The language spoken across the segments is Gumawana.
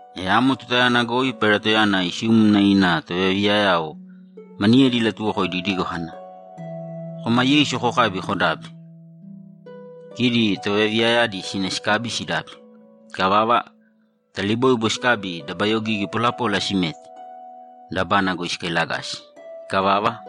E amo tutayana goi Pailatoyana isiumna ina tovayaviyayao maniyedi ilatuwokoidi idigo kana, ‘Kōma Yeisu kokābi, kodābi.’ Kidi tovayaviyayadi sina sikabi sidabi. Ikavava, taliboibo sikabi dabayogigi polapola simete, dabana goi sikailagasi. Ikavava,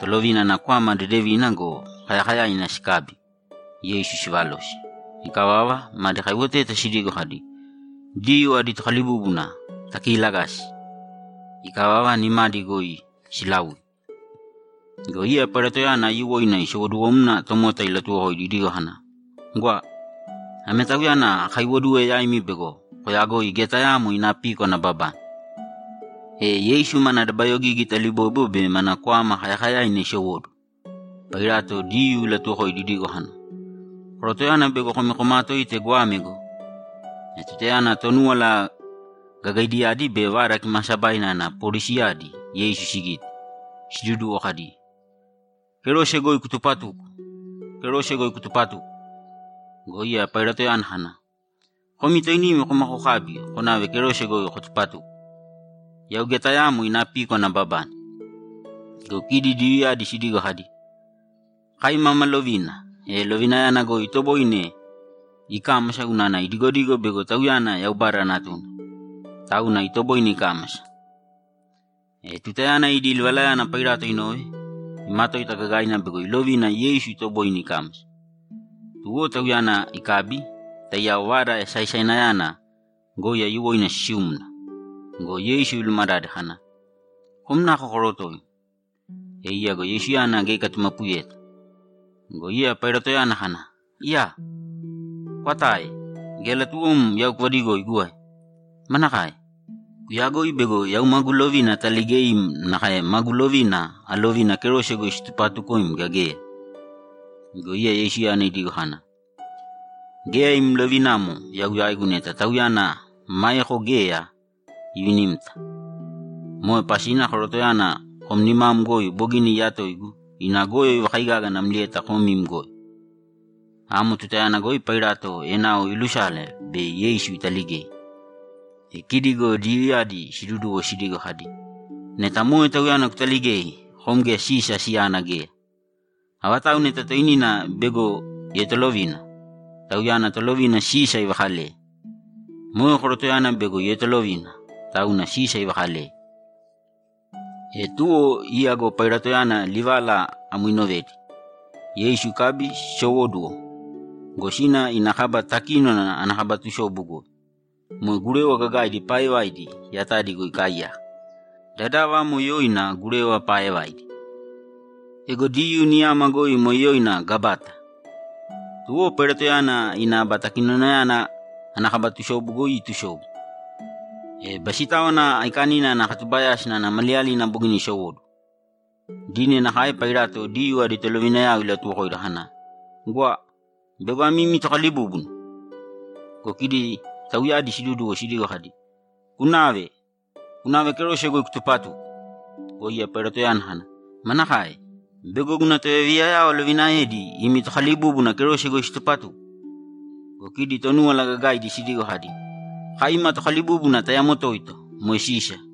tolovina ana kwama dedeviina go, kayakayaina sikabi, Yeisu sivalosi. Ikavava, madi kaiwoteta sidigo kadi, ‘Diyuu adi Tokalibúbuna takiilagāsi!’ Ikavava, nimadi goi silaui. Go iya Pailatoyana aiyuwoina isowoduwomna tomota ilatuwokoidi idigo kana, ‘Gwa! Ame Tauyana akaiwoduwe yaimi bego koyagoi geya tayaamo ina píkwana ababane.’ E Yeisu mana dabayogigi taliboibo be mana kwama kayakayaina isowóduwo, Pailato Diyuu ilatuwokoidi idigo kana, ‘Korotoyana bego komi komaatoite goame go!’ E tutayana Tonúwala Gagaidiyadi be Vada Kimaasabaina ana polisiyadi Yeisu sigite, siduduwo kadi, ‘Kerose goi kutupatūko! Kerose goi kutupatūko!’ Go iya Pailatoyana kana, ‘Komi toinimi kōma kokābi konāve kerose goi kotupatūko. Yau geya tayaamo ina píkwana ababane.’ Go kidi Diyuuyadi sidigo kadi, ‘Kai mama lovina, e lovinayana goi itoboine ikámasa unana idigodigo bego Tauyana Yaubada Natuna, tauna itoboine ikámasa.’ E tutayana idi livalayana Pailato inove, imatoita gagaina bego ilovina Yeisu itoboine ikámasa. Tuwo Tauyana ikabi, taiyao vada esaesainayana goi aiyuwoina sisiumna go, Yeisu ilumadade kana, ‘Kom nako korotoim?’ E iya go Yeisuyana geya ikatumapuyeta. Go iya Pailatoyana kana, ‘Iyaa! Kwatae; geya latuwom yau kuvadigoigu ae? Manakae? Kuyagoi bego yau magu lovina ataligeim nakae magu lovina alovina kerose goi situpatukoim, gea geya?’ Go iya Yeisuyana idigo kana, ‘Geya im lovinamo yau yaigu neta Tauyana maeko geya ivinimta. Moe pasina korotoyana kom nimam goi bogina iyatoigu ina goyo ivakaigaga namlieta kom im goyo.’ Amo tutayana goi Pailato enao iilusala bei Yeisu italigei. E kidi go Diyuuyadi siduduwo sidigo kadi, ‘Neta moe Tauyana kutaligei, kom geya Sisa siyana geya! Avatau neta toinina bego ietolovina, tauyana tolovina Sisa ivakaleye. Moe korotoyana bego ietolovina, tauna Sisa ivakaleye.’ E tuwo iya go Pailatoyana livala amo inovedi, Yeisu ikabi sisowóduwo go, sina ina kaba takínona ana kaba tusobu goi. Moe gurewa gagaidi paaevaidi yatadi goi ikaaiyaka. Dadava amo yoina Gurewa Paaevaidi. Ego Diyuu niyama goi moe yoina Gabata. Tuwo Pailatoyana ina aba takinonayana ana kaba tusobu goi itusobu. E Basitáwana Aikanina ana katubayásina ana maliyalina bogina isowóduwo. Dine nakae Pailato Diyuu adi tolovinayao ilatuwokoidi kana, ‘Gwa! Bego ame imi Tokalibúbuna!’ Go kidi tauyadi siduduwo sidigo kadi, ‘Kunāve! Kunāve kerose goi kutupatūko!’ Go iya Pailatoyana kana, ‘Manakae? Bego guna tovayaviyayao alovinaedi imi Tokalibúbuna kerose goi situpatuko?’ Go kidi Tonúwala Gagaidi sidigo kadi, ‘Kai ima tokalibúbuna tayamo toito, moe Sisa!’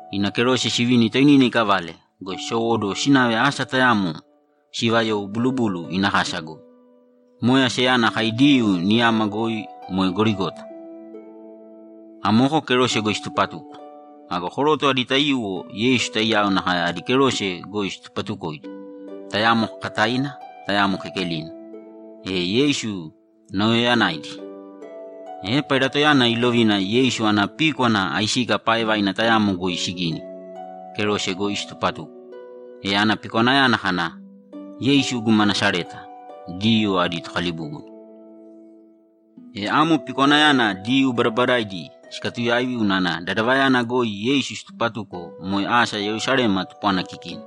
ina kerose sivini toinina ikavale go, sisowoduwe sinave asa tayamo siivayou Bulubulu ina Kasa goi. Moe asayana kai Diyuu niyama goi moe Gorigota. Amoko kerose goi situpatuko. Ago koroto adi taiyuwo Yeisu taiyao nakae adi kerose goi situpatukoidi, tayamo kakataina, tayamo kekelina, e Yeisu nauyayanaidi. E Pailatoyana ilovina Yeisu ana píkwana aisika paaevaina tayamo goi sigini, kerose goi situpatuko. E ana pikwanayana kana, ‘Yeisu guma Nasareta, Diyuu adi Tokalibúbuna.’ E ame pikwanayana Diyuu badabadaidi sikatuyaivi unana dadavayana goi Yeisu situpatuko moe asa Yerusalema tupwana kikina,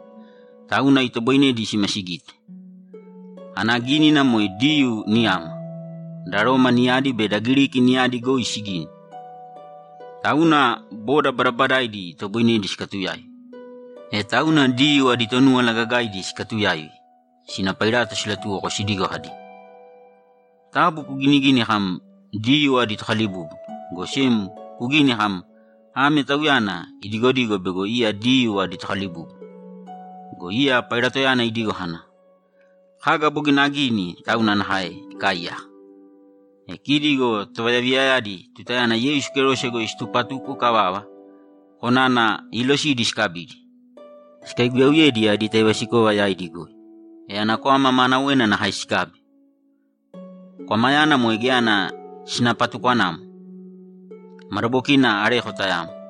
tauna itoboinedi sima sigite. Ana gínina moe Diyuu niyama, da Roma niyadi be da Giriki niyadi goi sigini, tauna boda badabadaidi itoboinedi sikatuyaivi. E tauna Diyuu adi Tonúwala Gagaidi sikatuyaivi, sina Pailato silatuwoko sidigo kadi, ‘Taabu kuginigīni kam, “Diyuu adi Tokalibúbuna.” Go sem kugīni kam, “Ame Tauyana idigodigo bego iya Diyuu adi Tokalibúbuna.”’ Go iya Pailatoyana idigo kana, ‘Kaga bogina agini tauna nakae ikaaiyaka.’ E kidi go tovayaviyayadi tutayana Yeisu kerose goi situpatuko ikavava, konana iilosidi sikabidi, sikaiguyauyedi adi taivasikova yaidi goi. E ana kwama maanawena nakae sikabi. Kwamayana moe geya ana sinapatukwanamo, madabokina areko tayamo.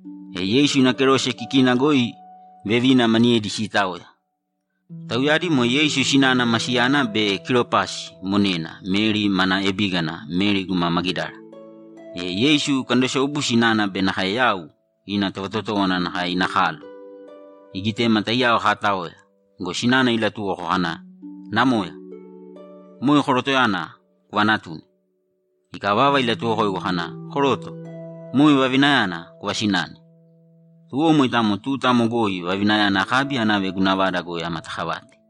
E Yeisu ina kerose kikina goi vevina maniyedi siitaoya. Tauyadi moe Yeisu sinana ma siyana be Kilopasi monena Meri mana ebígana Meri guma Magidara. E Yeisu ikandosobu sinana be nakae yau, ina tovatotówana nakae ina kalo, igitema taiyao kaataoya go, sinana ilatuwoko kana, ‘Namoya, moe korotoyana kuvanatūne.’ Ikavava, ilatuwokoigu kana, ‘Koroto, moe vavinayana kuvasināne.’ Tuwo moitamo tuta amo goi vavinayana akabi anave guna vada goi amatakavate.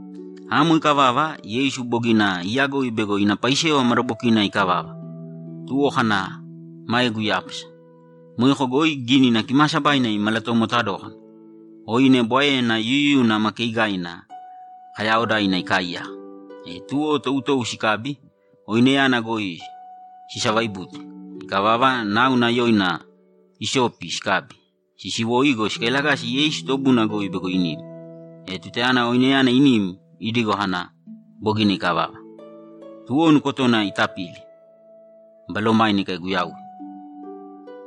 Amo ikavava, Yeisu bogina iyagoi bego ina paisewa madabokina ikavava, tuwo kana, ‘Maegu iyápasa.’ Moeko goi Gínina Kimaasabaina imalatomota dókana. Oine bwaena yuyuyuna ma keigaina kayaaodaina ikaaiyaka. E tuwo toutou sikabi, oineyana goi sisavaibute. Ikavava, náuna yoina isopi sikabi, sisisiwo go, sikailagasi Yeisu tobuna goi bego inim. E tutayana oineyana inim, idigo kana, ‘Bogina ikavava.’ Tuwo nukotona itapili, balomaina ikaiguyauye.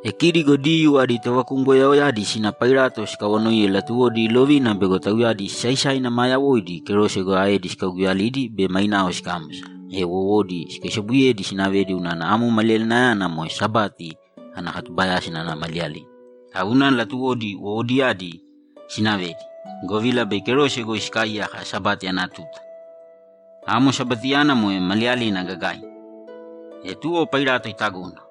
E kidi go Diyuu adi tovakumgoyaoyadi sina Pailato sikawanoiye latuwodi ilovina bego tauyadi sisaisaina maa yawoidi kerose goi aedi sikauguyalidi be mainao sikámasa, e wowodi sikaisobuyedi sinavedi unana amo maliyalinayana moe Sabati ana katubayásina ana maliyalina. Tauna latuwodi wowodiyadi sinavedi, govila bei kerose goi sikaaiyaka Sabati ana tuta. Amo Sabatiyana moe maliyalina gagaina. E tuwo Pailato itagona.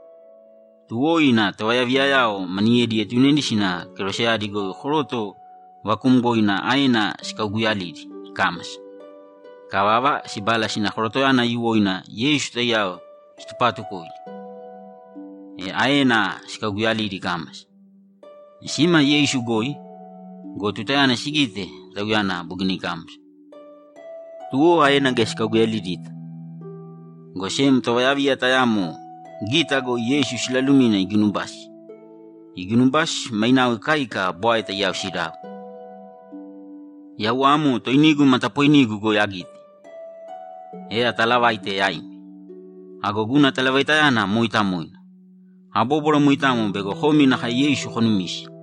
Tuwo ina tovayaviyayao maniyedi ietunedi sina keroseyadi goi koroto vakuumgoina aena sikauguyalidi ikámasa. Ikavava, sibala sina korotoyana aiyuwoina Yeisu taiyao situpaatukoidi, e aena sikauguyalidi ikámasa. E sima Yeisu goi go, tutayana sigite, Tauyana bogina ikámasa, tuwo aena geya sikauguyalidita, go sem tovayaviya tayamo gita goi Yeisu silalumina iginubasi. Iginubasi, mainao ikaika bwae taiyao sidau. Yau amo toinigu matapoinigu goi agite, e atalavaite yaimi. Ago guna talavaitayana mooitamoina. Abóbwara moitamo bego komi nakae Yeisu konumise.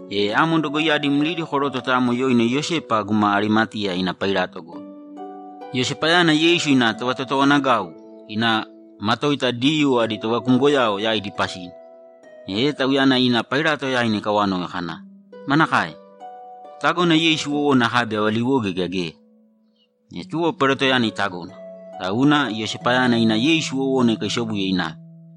E amo dogoiyadi mlidi koroto tayamo yoina Iyosepa guma Arimateya ina Pailato goi. Iyosepayana Yeisu ina tovatotowanagau ina matoita Diyuu adi tovakumgoyao yaidi pasina. E tauyana ina Pailato yaina ikawanoi kana, ‘Manakae? Kutagona Yeisu wowona akabi avaliwoge gea geya?’ E tuwo Pailatoyana itagona. Tauna Iyosepayana ina Yeisu wowona ikaisobuye inave.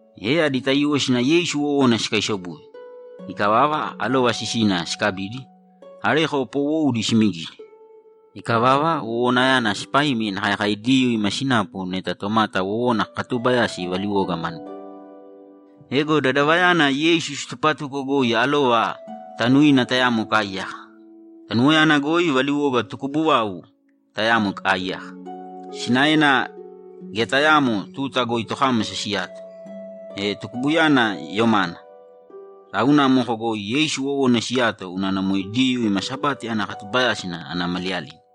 E adi taiyuwo sina Yeisu wowona sikaisobuye. Ikavava, alova sisina sikabidi, areko poowoudi simigidi. Ikavava, wowonayana sipaimi nakae kai Diyuu ima sinapu neta tomata wowona kakatuubayasi valiwoga manuna. Ego dadavayana Yeisu situpatuko goi alova tanuina tayamo ikaaiyaka. Tanuwoyana goi valiwoga tukubu vau tayamo ikaaiyaka. Sinaena geya tayaamo tuta goi tokámasa siyato. E tukubuyana yomana, tauna amoko goi Yeisu wowona siyato unana moe Diyuu ima Sabati ana katubayásina ana maliyalina.